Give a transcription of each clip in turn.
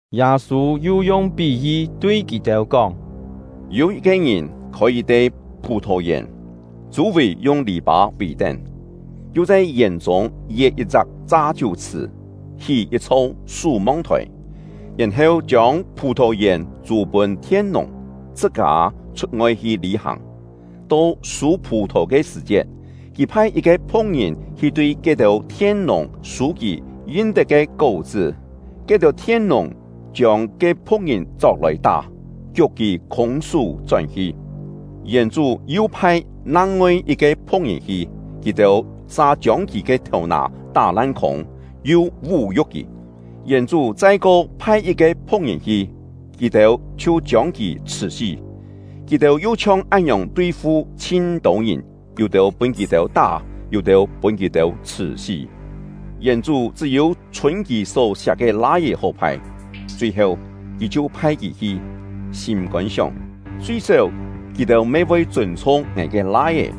Yâ-sû yu yung pí-yi tui kì-têu kóng: “Yû yit-ke ngìn khôi yit-te phù-thò-yèn, chû-vì yung lì-pâ vì-tén, yu chhai yèn-chûng yet yit-chak cha-chiú-chhṳ̀, hí yit-chho sú-mong-thòi, yèn-heu chiông phù-thò-yèn chû pûn thien-nùng, chhṳ-kâ chhut-ngoi hi lî-hàng. To sû phù-thò ke sṳ̀-chiet, kì phai yit-ke phu̍k-ngìn hi tui ke-têu thien-nùng sû kì yin-tet ke kó-chṳ́. Ke-têu thien-nùng chiông ke phu̍k-ngìn chok-lòi tá, kiuk kì khûng-sú chón-hi. Yèn-chú yu phai nang-ngoi yit-ke phu̍k-ngìn hi; kì-têu sa chiông kì ke thèu-nà tá lan-khûng, yu vú-yu̍k kì. Yèn-chú chai-ko phai yit-ke phu̍k-ngìn hi, kì-têu chhiu chiông kì chhṳ̀-sí. Kì-têu yu chhiong án-ngiòng tui-fu chhin-tô ngìn, yû-têu pûn kì-têu tá, yû-têu pûn kì-têu chhṳ̀-sí. Yèn-chú chṳ́-yû chhûn kì só siak ke lai-é hó phai. Chui-heu, kì chhiu phai kì hi, sîm-kôn sióng: ‘Chui-séu, kì-têu me voi chûn-chhung ngài ke lai-é.’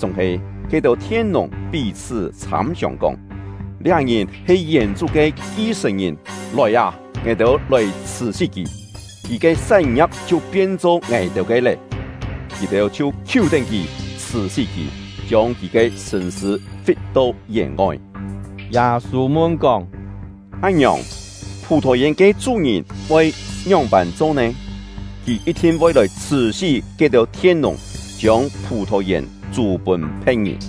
Chúng-he ke-têu thien-nùng pí-chhṳ́ chhâm-siòng kóng: ‘Liá ngìn he yèn-chú ke ki-sṳ̀n-ngìn; lòi â, ngài-têu lòi chhṳ̀-sí kì, kì ke sán-ngia̍p chhiu pien-cho ngài-têu ke lé!’ Kì-têu chhiu khiú-tén kì, chhṳ̀-sí kì, chiông kì ke sṳ̂n-sṳ̂ fit-to yèn-ngoi.” Yâ-sû mun-kóng: “Án-ngiòng, phù-thò-yèn ke chú-ngìn voi ngióng-pân cho nè? Kì yit-thin voi lòi chhṳ̀-sí ke-têu thien-nùng, chiông phù-thò-yèn chû pûn phe̍t-ngìn.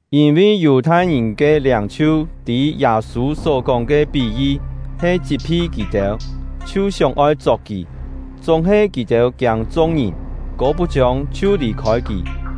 Yîn-vi Yù-thai-ngìn ke liâng-chhiu tî Yâ-sû só kóng ke pí-yi he chit-phi kì-têu, chhiu sióng-oi chok kì. Chúng-he kì-têu kiâng chung-ngìn, kô-put-chiông chhiu lì-khôi kì.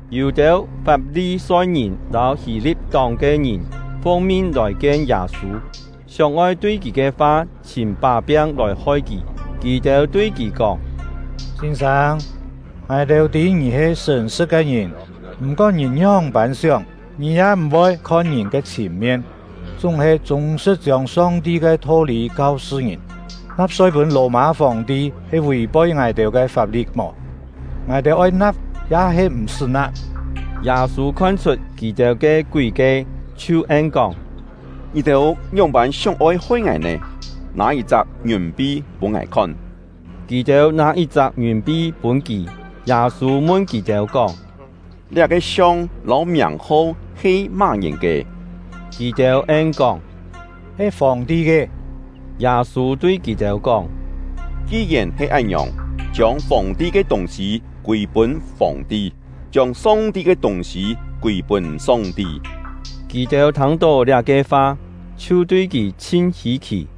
Yû-têu Fap-li-soi-ngìn lâu Hî-li̍t-tóng ke ngìn fung-min lòi-kien Yâ-sû, sióng-oi tui kì ke fa chhìm pá-piang lòi hoi kì. Kì-têu tui kì kóng: “Sîn-sâng, ngài-têu tî ngì he sṳ̀n-sṳ̍t ke ngìn; m̀-kón ngìn ngióng-pân sióng, ngì ya m̀-voi khon ngìn ke chhìn-mien, chúng-he chûng-sṳ̍t chiông Song-ti ke tho-lî kau-sṳ ngìn. Na̍p-soi pûn Lò-mâ Fòng-ti he vì-poi ngài-têu ke fap-li̍t mò? Ngài-têu oi na̍p ya-he m̀-sṳ́ na̍p?” Yâ-sû khon-chhut kì-têu ke kúi-kie, chhiu en-kóng: “Ngì-têu ngióng-pân sióng-oi hoi ngài nè? Nâ yit-chak ngiùn-pi pûn ngài khon!” Kì-têu nâ yit-chak ngiùn-pi pûn kì. Yâ-sû mun kì-têu kóng: “Liá-ke siong lâu miàng-ho he má-ngìn ke?” Kì-têu en-kóng: “He Fòng-ti ke.” Yâ-sû tui kì-têu kóng: “Ki-yèn he án-ngiòng, chiông Fòng-ti ke tûng-sî kûi-pûn Fòng-ti, chiông Song-ti ke tûng-sî kûi-pûn Song-ti.” Kì-têu thâng-tó liá-ke fa, chhiu tui kì chhin hî-khì.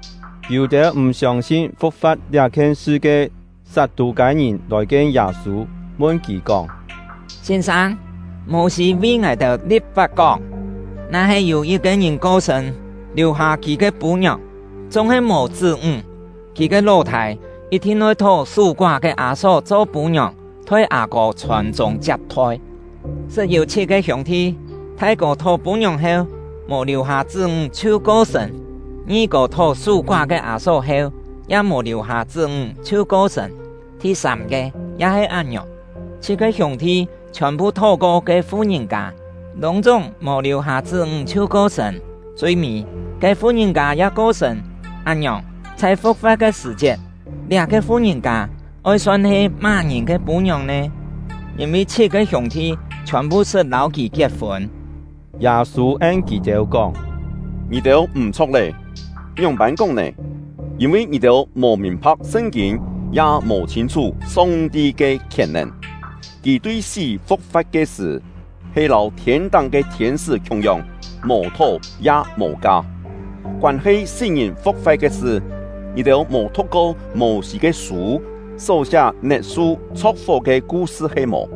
Yû-têu m̀ siông-sin fu̍k-fa̍t liá-khien sṳ ke Sat-tû-kâi-ngìn lòi-kien Yâ-sû, mun kì kóng: “Sîn-sâng, Mô-sî vi ngài-têu li̍p-fap kóng: ‘Na-he yû yit-ke ngìn ko-sṳ̂n, liù-hâ kì ke pû-ngiòng, chúng-he mò chṳ́-ńg, kì ke ló-thâi yit-thin oi thó sú-koá ke â-só cho pû-ngiòng, thoi â-kô chhòn-chûng chiap-thoi.’ Sṳt yû chhit-ke hiûng-thi: Thai-kô thó pû-ngiòng heu, mò liù-hâ chṳ́-ńg chhiu ko-sṳ̂n; ngi-kô thó sú-koá ke â-só heu, ya mò liù-hâ chṳ́-ńg chhiu ko-sṳ̂n; thi-sâm-ke ya he án-ngiòng. Chhit-ke hiûng-thi chhiòn-phu thó-ko ke fu-ngìn-kâ, lûng-chúng mò liù-hâ chṳ́-ńg chhiu ko-sṳ̂n. Chui-mî, ke fu-ngìn-kâ ya ko-sṳ̂n. Án-ngiòng, chhai fu̍k-fa̍t ke sṳ̀-chiet, liá-ke fu-ngìn-kâ oi son he má-ngìn ke pû-ngiòng nè? Yîn-vi chhit-ke hiûng-thi chhiòn-phu sṳt lâu kì kiet-fûn.” Yâ-sû en kì-têu kóng: “Ngì-têu m̀-chho̍k lé, ngióng-pân kóng nè? Yîn-vi ngì-têu mò mìn-pha̍k Sṳn-kîn, ya mò chhîn-chhú Song-ti ke khièn-nèn. Kì-têu tui sí fu̍k-fa̍t ke sṳ̀, he lâu thiên-táng ke thiên-sṳ́ khiung-yong, mò thó ya mò ka. Koân-he sí-ngìn fu̍k-fa̍t ke sṳ, ngì-têu mò thu̍k-ko Mô-sî ke sû só-siá net-su chho̍k-fó ke ku-sṳ he-mò?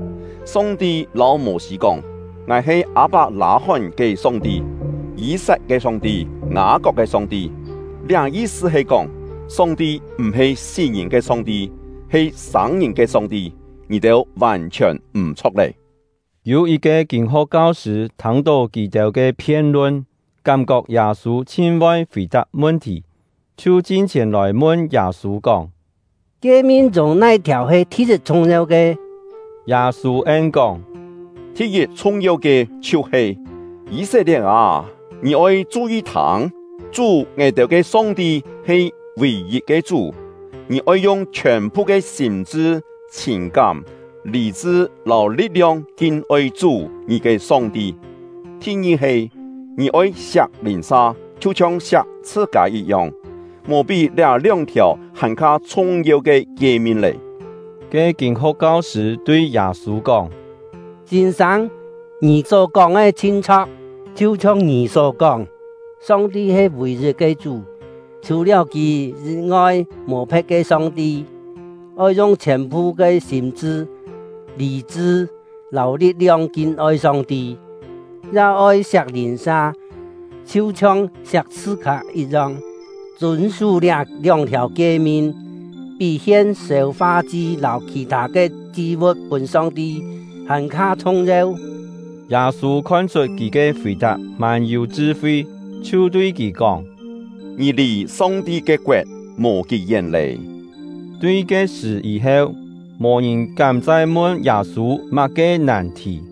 Song-ti lâu Mô-sî kóng: ‘Ngài he Â-pak-lâ-hón ke Song-ti, Yî-sat ke Song-ti, Ngâ-kok ke Song-ti.’ Liá yi-sṳ he kóng, Song-ti m̀-he sí-ngìn ke Song-ti, he sâng-ngìn ke Song-ti. Ngì-têu vàn-chhiòn m̀-chho̍k lé!” Yû yit-ke kîn-ho̍k kau-sṳ̂ thâng-tó kì-têu ke phien-lun, kám-kok Yâ-sû chhin voi fì-tap mun-thì, chhiu chin-chhièn lòi mun Yâ-sû kóng: “Kie-min chûng nai-thiàu he thi-yit chhung-yeu ke?” Yâ-sû en-kóng: “Thi-yit chhung-yeu ke chhiu-he: ‘Yî-set-lie̍t â, ngì oi chu-yi thâng! Chú — ngài-têu ke Song-ti he vì-yit ke Chú. Ngì oi yung chhiòn-phu ke sîm-chṳ, chhìn-kám, lî-chṳ lâu li̍t-liong kin-oi Chú — ngì ke Song-ti.’ Thi-ngi he: ‘Ngì oi siak lìn-sa, chhiu-chhiong siak chhṳ-kâ yit-yong.’ Mò pí liá lióng-thiàu hàn-kha chhung-yeu ke kie-min lé.” Ke kîn-ho̍k kau-sṳ̂ tui Yâ-sû kóng: “Sîn-sâng, ngì só kóng ke chhin chho̍k! Chhiu-chhiong ngì só kóng, Song-ti he vì-yit ke Chú, chhù-liáu Kì yî-ngoi mò phe̍t ke Song-ti. Oi yung chhiòn-phu ke sîm-chṳ, lî-chṳ lâu li̍t-liong kin-oi Song-ti; ya oi siak lìn-sa, chhiu-chhiong siak chhṳ-kâ yit-yong. Chûn-sú liá lióng-thiàu kie-min, pí hien sêu-fa-chi lâu khì-thâ ke chi-vu̍t pûn Song-ti hàn-kha chhung-yeu.” Yâ-sû khon-chhut kì ke fì-tap mân-yû chṳ-fi, chhiu tui kì kóng: “Ngì lì Song-ti ke koet mò kí-yén lé.” Tui ke-sṳ̀ yî-heu, mò ngìn kám chai mun Yâ-sû má-ke nàn-thì.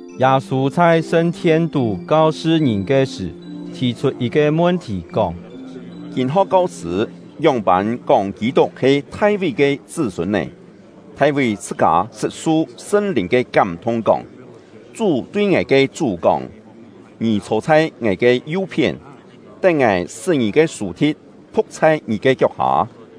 Yâ-sû chhai sṳn-thien-tú kau-sṳ ngìn ke sṳ̀, thì-chhut yit-ke mun-thì, kóng: “Kîn-ho̍k kau-sṳ̂ ngióng-pân kóng Kî-tuk he Thai-ví ke chṳ́-sûn nè? Thai-ví chhṳ-kâ sṳt su Sṳn-Lìn ke kám-thung kóng: Chú tui ngài ke Chú kóng: ‘Ngì chhô chhai Ngài ke yu-phién, tén Ngài sṳ́ ngì ke sù-thi̍t phu̍k chhai ngì ke kiok-hâ.’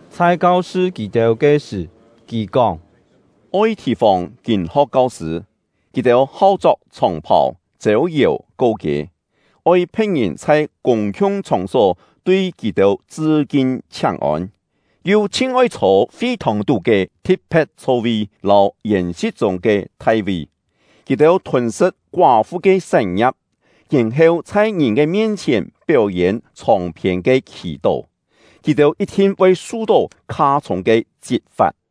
Chhai kau-sṳ kì-têu ke sṳ̀, kì kóng: “Oi thì-fòng kîn-ho̍k kau-sṳ̂; kì-têu hau chok chhòng-phàu, chêu-yèu ko-kiê, oi phe̍t-ngìn chhai kûng-khiung chhòng-só tui kì-têu chṳ-kin chhiáng-ôn, yu chhin oi chhô fi-thòng-tú ke thi̍t-phe̍t chho-vi lâu yèn-si̍t chûng ke thai-vi. Kì-têu thûn-sṳ̍t koá-fu ke sán-ngia̍p, yèn-heu chhai ngìn ke mien-chhièn péu-yên chhòng-phiên ke khì-tó. Kì-têu yit-thin voi su-tó kha-chhûng ke chit-fa̍t!”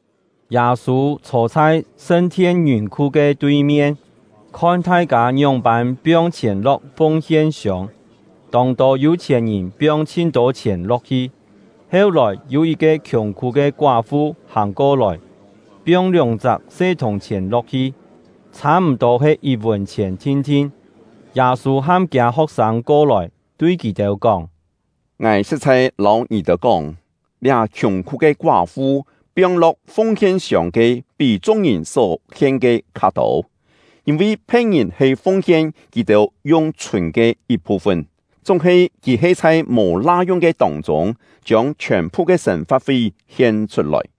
Yâ-sû chhô chhai sṳn-thien ngiùn-khu ke tui-mien, khon thai-kâ ngióng-pân piong chhièn lo̍k fung-hien-siông. Tông-tô yû-chhièn-ngìn piong chhin-tô chhièn lo̍k-hi; heu-lòi yû yit-ke khiùng-khú ke koá-fu hàng ko-lòi, piong lióng-chak se thùng-chhièn lo̍k-hi, chhâ-m̀-tô he yit-vùn-chhièn thin-thin. Yâ-sû ham kiâ ho̍k-sâng ko-lòi, tui kì-têu kóng: “Ngài sṳ̍t-chhai lâu ngì-têu kóng, liá khiùng-khú ke koá-fu piong-lo̍k fung-hien-siông ke pí chung-ngìn só-hien ke kha-tô. Yîn-vi phe̍t-ngìn he fung-hien kì-têu yung chhûn ke yit-phu-fun; chúng-he kì he chhai mò la-yung ke tông-chûng, chiông chhiòn-phu ke sên-fa̍t-fi hien-chhut-lòi.”